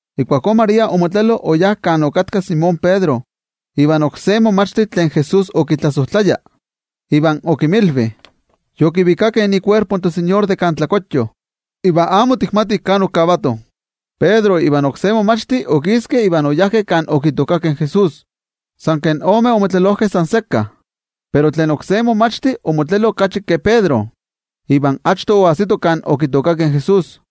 Ijkuakó María omotlelo oyá kan okatka Simón Pedro ivan oksé momachti tlen Jesús okitlasojtlaya, iva okinmilvi: —Okivikakeh ikuerpo in toTeko de kan mikatekochtli, iva amo tikmatih kan okavatoh. Pedro ivan oksé momachti okiskeh iva oyajkeh kan mikatekochtli. Nochtin omeh omotlelojkeh san sekka, pero tlen oksé momachti omotlelo okachi ke Pedro iva achto oajsito kan mikatekochtli.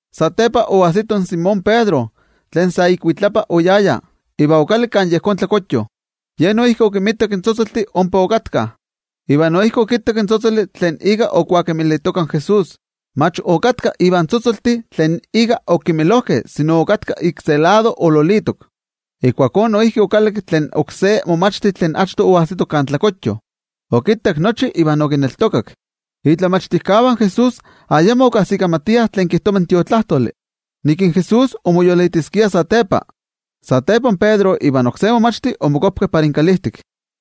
Satepa oajsito in Simón Pedro, tlen sa ikuitlapa oyaya, iva okalakki kan mikatekochtli. Ye noijki okinmitak in tzotzoltih ompa okatkah. Iva noijki okittak in tzotzoli tlen ika okuakemilitoka in Jesús, mach okatka ivan tzotzoltih tlen ika okemilojkeh, sino okatka sekka ololitok. Ijkuakó noijki okalakki tlen oksé momachti tlen achto oajsito kan mikatekochtli. Okittak nochi, iva okineltokak. In momachtijkeh de Jesús ayamo okajsikamatiah tlen kijtova in Tiotlajkuiloli, nik Jesús omoyolitiskia satepa. Satepa in Pedro ivan oksé momachti omokuapkeh para inkalijtik.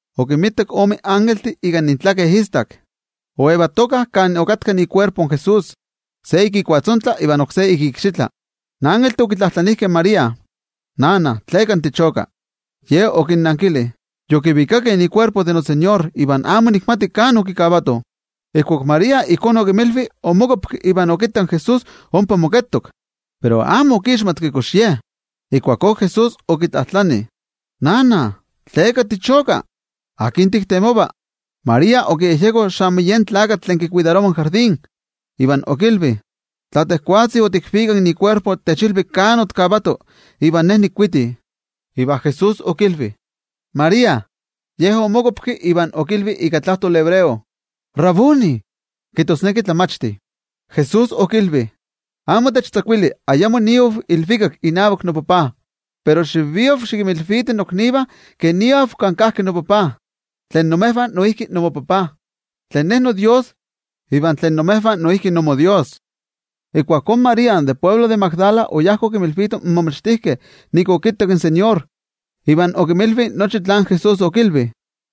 okinmitak ome ilvikaktlatitlaniltih ika intlaken istak. Oyejyetokah kan okatka ikuerpo in Jesús, se ik ikuatzontla iva oksé ik ikxitla. In ilvikaktlatitlaniltih okitlajtlanijkeh in María: —Sivatl, ¿tleka tichoka? Ye okinnankili: —Okivikakeh ikuerpo in noTeko iva amo nikmati kan okikavatoh. Ijkuak María ijkó okinmilvi, omokuapki iva okittak in Jesús ompa moketok, pero amo okixmatki kox Ye. Ijkuakó Jesús okitlajtlani: —Sivatl, ¿tleka tichoka? ¿Akin tiktemova? María okiyejyeko xamo yen tlakatl tlen kikuidarova in tlatokxochío, iva okilvi: —Tla tejwatzi otikvikak in kuerpo, techilvi kan otikavato, iva ne nikuiti. Iva Jesús okilvi: —¡María! Ye omokuapki iva okilvi ika tlajtoli hebreo: —¡Raboni! —kijtosneki Tlamachti. Jesús okilvi: —Techkajkava, porke ayamo niav ilvikak inavak noTajtzi. Pero xivia xikinmilviti noknivah ke niav kan kajki noTajtzi tlen imejvah noijki inmoTajtzi, tlen Ne noDios iva tlen imejvah noijki inmoDios. Ijkuakó María tlen de altepetl Magdala oyá okinmilvito in momachtijkeh nik okittak in toTeko, iva okinmilvi nochi tlen Jesús okilvi.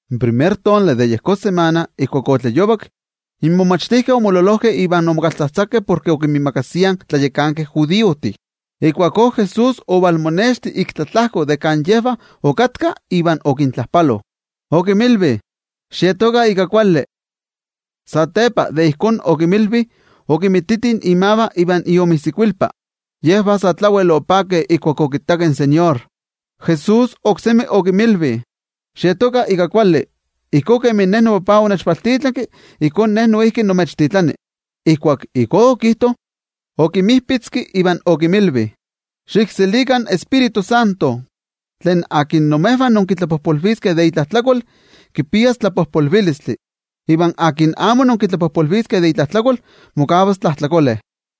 In primer tonali de yejón samana ijkuak otlayovak, in momachtijkeh omololojkeh iva omokaltzajtzakeh porke okinmiimakasiah in tlayakankeh judiojtih. Ijkuakó Jesús ovalmonexti ik tlatlajko de kan yejvah okatkah iva okintlajpalo, okinmilvi: —¡Xietokah ika kuali! Satepa de ijkó okinmilvi, okimititi imavah iva iomijsikuilpa. Yejvah sa tlawel opakeh ijkuak okittakeh in toTeko. Jesús oksemi okinmilvi: —¡Xietokah ika kuali! Ijkó kemi noTajtzi onechvaltitlanki, ijkó Ne noijki nimechtitlani. Ijkuak ijkó okijto, okinmijpitzki iva okinmilvi: —Xikselikah in Tioijyotzintli. Tlen imejvah inkitlapojpolviskeh de itlajtlakol, kipias tlapojpolvilistli. Iva tlen amo inkitlapojpolviskeh de itlajtlakol, mokavas tlajtlakole.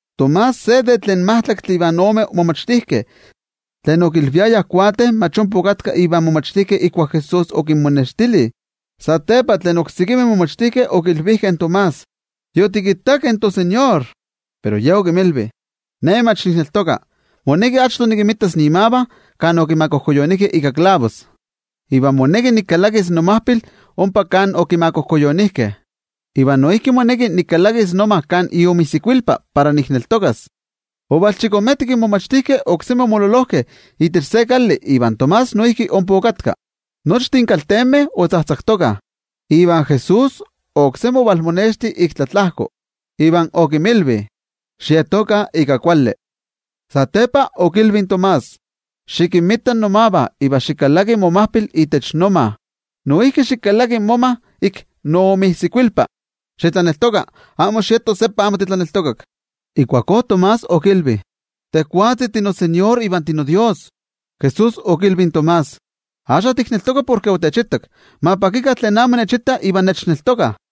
Tomás, se de tlen majtlaktli ivan ome momachtijkeh, tlen okilviayah Nenetl, mach ompa okatka ivan momachtijkeh ijkuak Jesús okinmonextili. Satepa, tlen oksekimeh momachtijkeh okilvijkeh in Tomás: —Yotikittakeh in toTeko. Pero ye okinmilvi: —Ne mach nikneltoka. Moneki achto nikinmitas imavah kan okimakojkuyonijkeh ika klavos iva moneki nikalakis nomajpil ompa kan okimakojkuyonijkeh. Iva noijki moneki nikalakis noma kan iomijsikuilpa, para nikneltokas. Ovalchikometik, in momachtijkeh oksemi omololojkeh itech se kali iva Tomás noijki ompa okatka. Nochtin kaltenmeh otzajtzaktokah, iva Jesús oksemi ovalmonexti ik tlatlajko, iva okinmilvi: —¡Xietokah ika kuali! Satepa okilvi in Tomás: —Xikinmita nomavah iva xikalaki momajpil itech noma. Noijki xikalaki moma ik noomijsikuilpa. Xitlaneltoka, amo xieto seppa amo titlaneltokak. Ijkuakó Tomás okilvi: —¡Tejwatzi tinoTeko iva tinoDios! Jesús okilvi in Tomás: —Axka tikneltoka porke otechitak. ¡Ma pakikah tlen amo nechittah iva nechneltokah!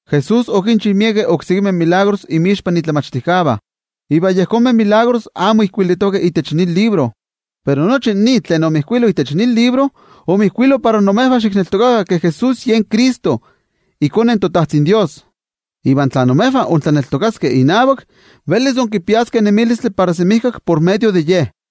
Jesús okinchi miekeh oksekimeh tetzavkaneskayomeh inmixpan momachtijkeh, tlen amo ijkuilitokeh itech nin libro. Pero nochi nin tlen ijkuilitok itech nin libro, omijkuilo para imejvah xikneltokakah ke Jesús yen Cristo, iKone toTajtzin Dios. Iva tla imejvah intlaneltokaskeh inavak, velis inkipiaskeh nemilistli para semijkak por medio de Ye.